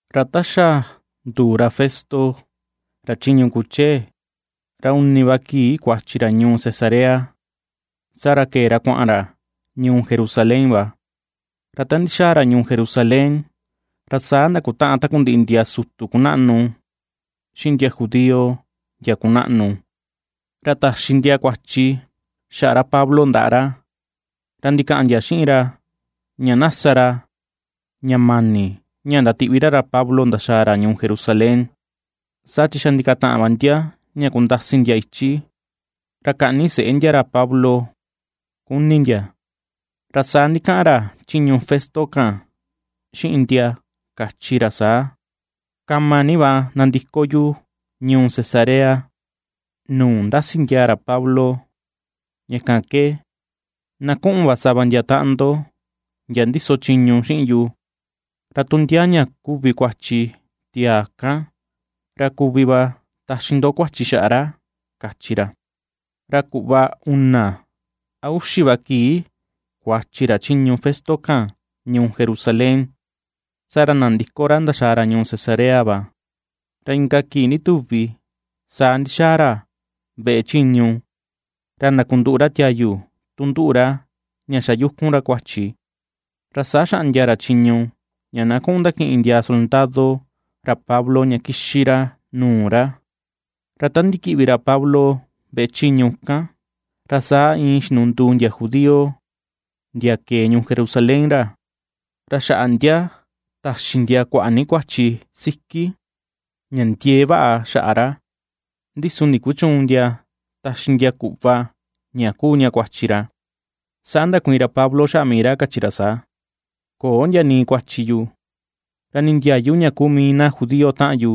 Ra ta xa nduu ra Festo ra chiñu kuchee, ra uni va kii kuachi ra ñuu Cesarea, saa ra kee ra kuaꞌan ra ñuu Jerusalén va. Ra ta ndixaa ra ñuu Jerusalén, ra saa ndakutaꞌan takundiꞌi ndia sutu kunaꞌnu xiꞌin ndia judío ndia kunaꞌnu, ra taxi ndia kuachi xaꞌa ra Pablo ndaꞌa ra. Ra ndikaꞌan ndia xiꞌin ra ña na sa ra ña mani, ña ndatiꞌvi ra ra Pablo ndaxaa ra ñuu Jerusalén. Saa chi xa ndikataꞌan va ndia ña kundasi ndia ichi, ra kaꞌni seꞌe ndia ra Pablo kuni ndia. Ra saa ndikaꞌan ra chiñu Festo kan, xiꞌin ndia kachi ra saa: ―Kama ni va nandiko yu ñuu Cesarea, nuu ndasi ndiaa ra Pablo. Ña kan ke na kuꞌun va sava ndia taꞌan ndo, ndia ndiso chiñu, xiꞌin yu, ra tu ndia ña kuvi kuachi tiaa kan, ra kuvi va taxi ndo kuachi xaꞌa ra ―kachi ra. Ra kuꞌva una a uxi va kii kuachi ra chiñu Festo kan ñuu Jerusalén, saa ra nandiko ra ndaxaa ra ñuu Cesarea va. Ra inka kii ndituvi saa ndixaꞌan ra veꞌe chiñu, ra ndakunduꞌu ra tiayu tu nduꞌu ra ña xa yukun ra kuachi, ra saa xaꞌndia ra chiñu ña na kuꞌun ndakiꞌin ndia soldado ra Pablo ña kixi ra nuu ra. Ra ta ndikiꞌvi ra Pablo veꞌe chiñu kan, ra saa iin xinunduu ndia judío ndia kee ñuu Jerusalén ra, ra xaꞌa ndia taxi ndia kuaꞌa ni kuachi siki ña ndiee vaꞌa xaꞌa ra, ndi su ndikuchüun ndia taxi ndia kuꞌva ña kuu ña kuachi ra. Saa ndakuiin ra Pablo xaꞌa mii ra, kachi ra saa: ―Köo ndia nii kuachi yu, ra nii ndiayu ña kuu mii na judío taꞌan yu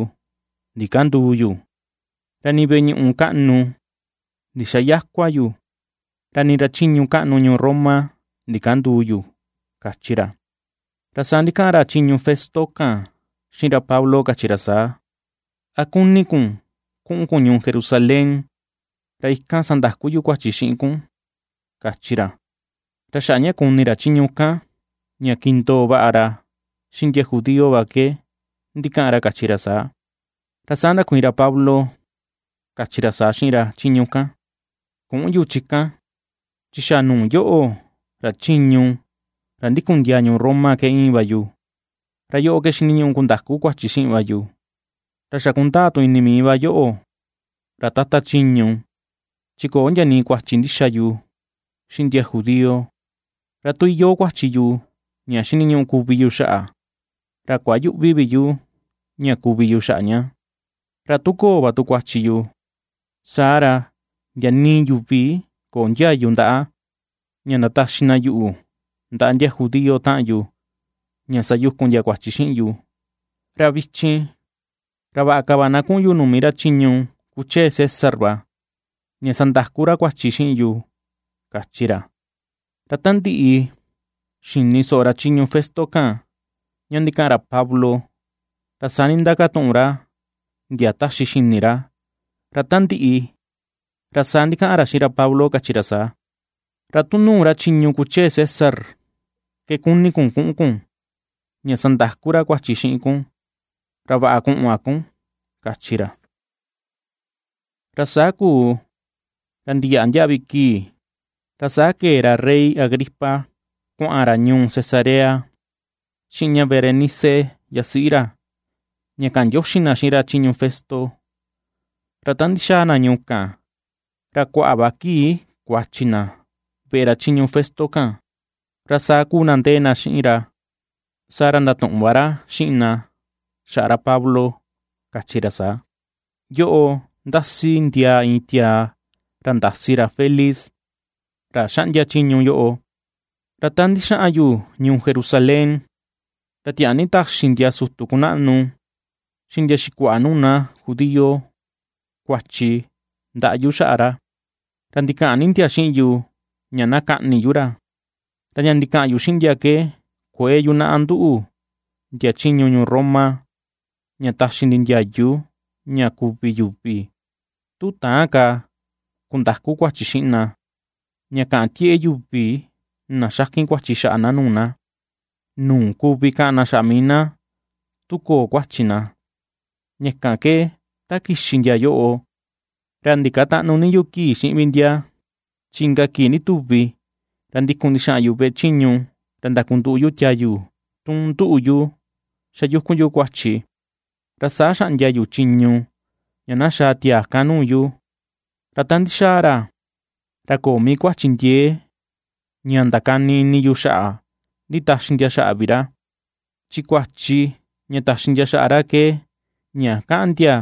ndikänduu yu, ra nii veꞌe ñuꞌu kaꞌnu ndixayäkua yu, ra nii ra chiñu kaꞌnu ñuu Roma ndikänduu yu ―kachi ra. Ra saa ndikaꞌan ra chiñu Festo kan xiꞌin ra Pablo, kachi ra saa: ―¿A kuni kun kuꞌun kun ñuu Jerusalén ra ikan sandaku yu kuachi xiꞌin kun? ―kachi ra. Ra xaꞌa ña kuni ra chiñu kan, ña kindoo vaꞌa ra xiꞌin ndia judío va ke ndikaꞌan ra kachi ra saa. Ra saa ndakuiin ra Pablo, kachi ra saa xiꞌin ra chiñu kan: ―Küꞌun yu chi kan, chi xa nuu yoꞌo, ra chiñu ra ndikun ndiaa ñuu Roma ke íin va yu, ra yoꞌo ke xiniñuꞌu kundaku kuachi xiꞌin va yu. Ra xa kundaa tu ini mii va yoꞌo ra Tata chiñu, chi köo ndia nii kuachi ndixa yu xiꞌin ndia judío. Ra tu iyoo kuachi yu ña xiniñuꞌu kuvi yu xaꞌa, ra kuayüꞌvi vi yu ña kuvi yu xaꞌa ña; ra tu köo va tu kuachi yu, saa ra ndia nii yuvi köo ndiayu ndaꞌa ña ndataxi na yuꞌu ndaꞌa ndia judío taꞌan yu ña sayukun ndia kuachi xiꞌin yu. Ra vichin, ra vaꞌa ka va na kuꞌun yu nuu mii ra chiñu kuchee César va, ña sandaku ra kuachi xiꞌin yu ―kachi ra. Ra ta ndiꞌi xini soꞌo ra chiñu Festo kan, ña ndikaꞌan ra Pablo, ra saa nindakatuꞌun ra ndia taxi xini ra, ra ta ndiꞌi, ra saa ndikaꞌan ra xiꞌin ra Pablo kachi ra saa: ―Ra tu nuu ra chiñu kuchee César ke kuni kun kuꞌun kun, ña sandaku ra kuachi xiꞌin kun. Ra vaꞌa kuꞌun va kun ―kachi ra. Ra saa kuu ra ndiyaꞌa ndiaꞌvi kii, ra saa kee ra rey Agripa kuaꞌan ra ñuu Cesarea xiꞌin ña Berenice yasiꞌi ra, ña kaꞌan ndioxi na xiꞌin ra chiñu Festo. Ra ta ndixaa na ñuu kan ra kuaꞌa va kii kuachi na veꞌe ra chiñu Festo kan, ra saa kuu na ndee xiꞌin ra, saa ra ndatuꞌun va ra xiꞌin na xaꞌa ra Pablo, kachi ra saa: ―Yoꞌo, ndasi ndiaa iin tiaa, ra ndasi ndiaa ra Felix, ra xaꞌndia chiñu yoꞌo. Ra ta ndixaꞌan yu ñuu Jerusalén, ra tiaa ni taxi ndia sutu kunaꞌnu xiꞌin ndia xikuaꞌa nuu na judío kuachi ndaꞌa yu xaꞌa ra, ra ndikaꞌan ni ndia xiꞌin yu ña na kaꞌni yu ra. Ra ña ndikaꞌan yu xiꞌin ndia ke kuëe yunaꞌa nduꞌu ndia chiñu ñuu Roma, ña taxi ndi ndiayu ña kuvi yuvi, tu täan ka kundaku kuachi xiꞌin na, ña kaꞌan tieꞌe yuvi na xakin kuachi xaꞌa na nuu na, nuu kuvi kaꞌan na xaꞌa mii na tu köo kuachi na. Ña kan ke ta kixi ndia yoꞌo, ra ndikatäꞌnu ni yu kii xiꞌin vi ndia, chi inka kii ndituvi ra ndikun ndixaꞌan yu veꞌe chiñu ra ndakunduꞌu yu tiayu tun nduꞌu yu xa yukun yu kuachi, ra saa xaꞌndia yu chiñu ña na xaa tiaa kan nuu yu. Ra ta ndixaa ra, ra köo mii kuachi ndiee ña ndakani ini yu xaꞌa nditaxi ndia xaꞌa vi ra. Chi kuachi ña taxi ndia xaꞌa ra ke, ña kaꞌan ndia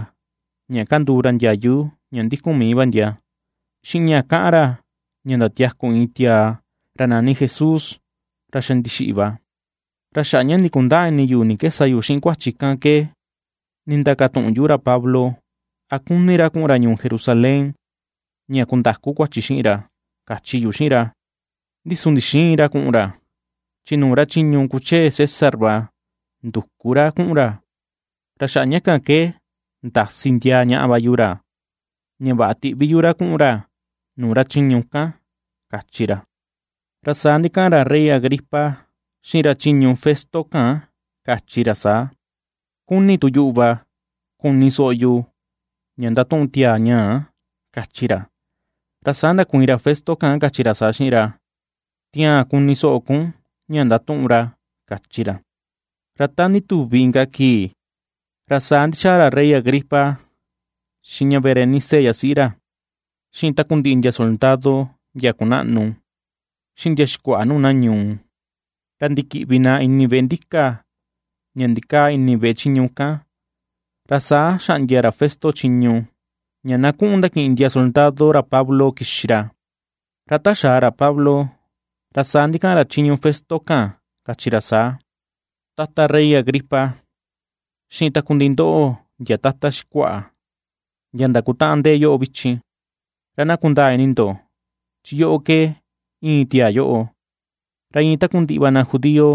ña kanduu ra ndiayu ña ndikun mii va ndia, xiꞌin ña kaꞌan ra ña ndatiaku iin tiaa ra nani Jesús, ra xa ndixiꞌi va. Ra xaꞌa ña ndikundäa ini yu ni ke sa yu xiꞌin kuachi kan ke nindakatuꞌun yu ra Pablo, a kuni ra kuꞌun ra ñuu Jerusalén ña kundaku kuachi xiꞌin ra, kachi yu xiꞌin ra. Ndi su ndixïin ra kuꞌun ra, chi nuu ra chiñu kuchee César va nduku ra kuꞌun ra, ra xaꞌa ña kan ke ndasi ndiaa ñaꞌa va yu ra, ña vaꞌa tiꞌvi yu ra kuꞌun ra nuu ra chiñu kan ―kachi ra. Ra saa ndikaꞌan ra rey Agripa xiꞌin ra chiñu Festo kan kachi ra saa: ―Kuni tu yuꞌu va kuni soꞌo ña ndatuꞌun tiaa ñaa ―kachi ra. Ra saa ndakuiin ra Festo kan kachi ra saa xiꞌin ra: ―Tiaan kuni soꞌo kun ña ndatuꞌun ra ―kachi ra. Ra ta ndituvi inka kii, ra saa ndixaa ra rey Agripa xiꞌin ña Berenice yasiꞌi ra, xiꞌin takundiꞌi ndia soldado ndia kunaꞌnu, xiꞌin ndia xikuaꞌa nuu na ñuu, ra ndikiꞌvi na ini veꞌe ndíka ña ndikaa ini veꞌe chiñu kan. Ra saa xaꞌndia ra Festo chiñu ña na kuꞌun ndakiꞌin ndia soldado ra Pablo kixi ra. Ra ta xaa ra Pablo, ra saa ndikaꞌan ra chiñu Festo kan, kachi ra saa: ―Tata rey Agripa, xiꞌin takundiꞌi ndoꞌo ndia tata xikuaꞌa, ndia ndakutaꞌan ndee yoꞌo vichin, ra na kundaa ini ndo chi yoꞌo ke íin tiaa yoꞌo. Ra iin takundiꞌi va na judío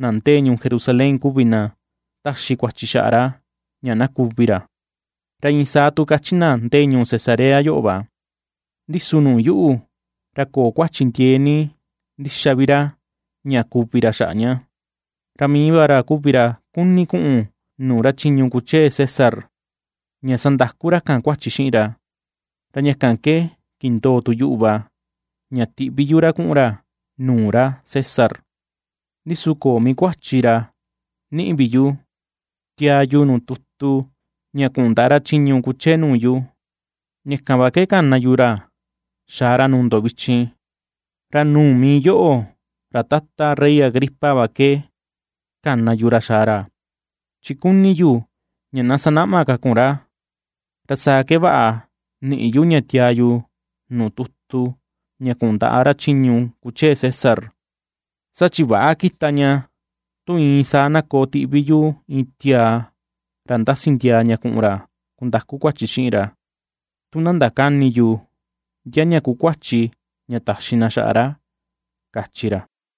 na ndee ñuu Jerusalén kuvi na ^taxi kuachi xaꞌa ra ña na kuvi ra, ra iin saa tu kachi na ndee ñuu Cesarea yoꞌo va. Ndi su nuu yuꞌu, ra köo kuachi ndiee ni ndixa vi ra ña kuvi ra xaꞌa ña. Ra mii va ra kuvi ra kuni kuꞌun nuu ra chiñu kuchee César, ña sandaku ra kan kuachi xiꞌin ra, ra ña kan ke kindoo tu yuꞌu va ña tiꞌvi yu ra kuꞌun ra nuu ra César. Ndi su köo mii kuachi ra niꞌi vi yu tiaa yu nuu tutu ña kuꞌun ndaꞌa ra chiñu kuchee nuu yu. Ña kan va ke kana yu ra xaa ra nuu ndo vichin, ra nuu mii yoꞌo ra tata rey Agripa va ke kana yu ra xaa ra, chi kuni yu ña na sanaꞌma ka kun ra, ra saa ke vaꞌa niꞌi yu ña tiaa yu nuu tutu ña kuꞌun ndaꞌa ra chiñu kuchee César. Saa chi väꞌa kita ña, tu iin saa na koo tiꞌvi yu iin tiaa ra ndasi ndiaa ña kuꞌun kundaku kuachi xiꞌin ra, tu na ndakäni yu, ndia ña kuu kuachi ña taxi na xaꞌa ra ―kachi ra.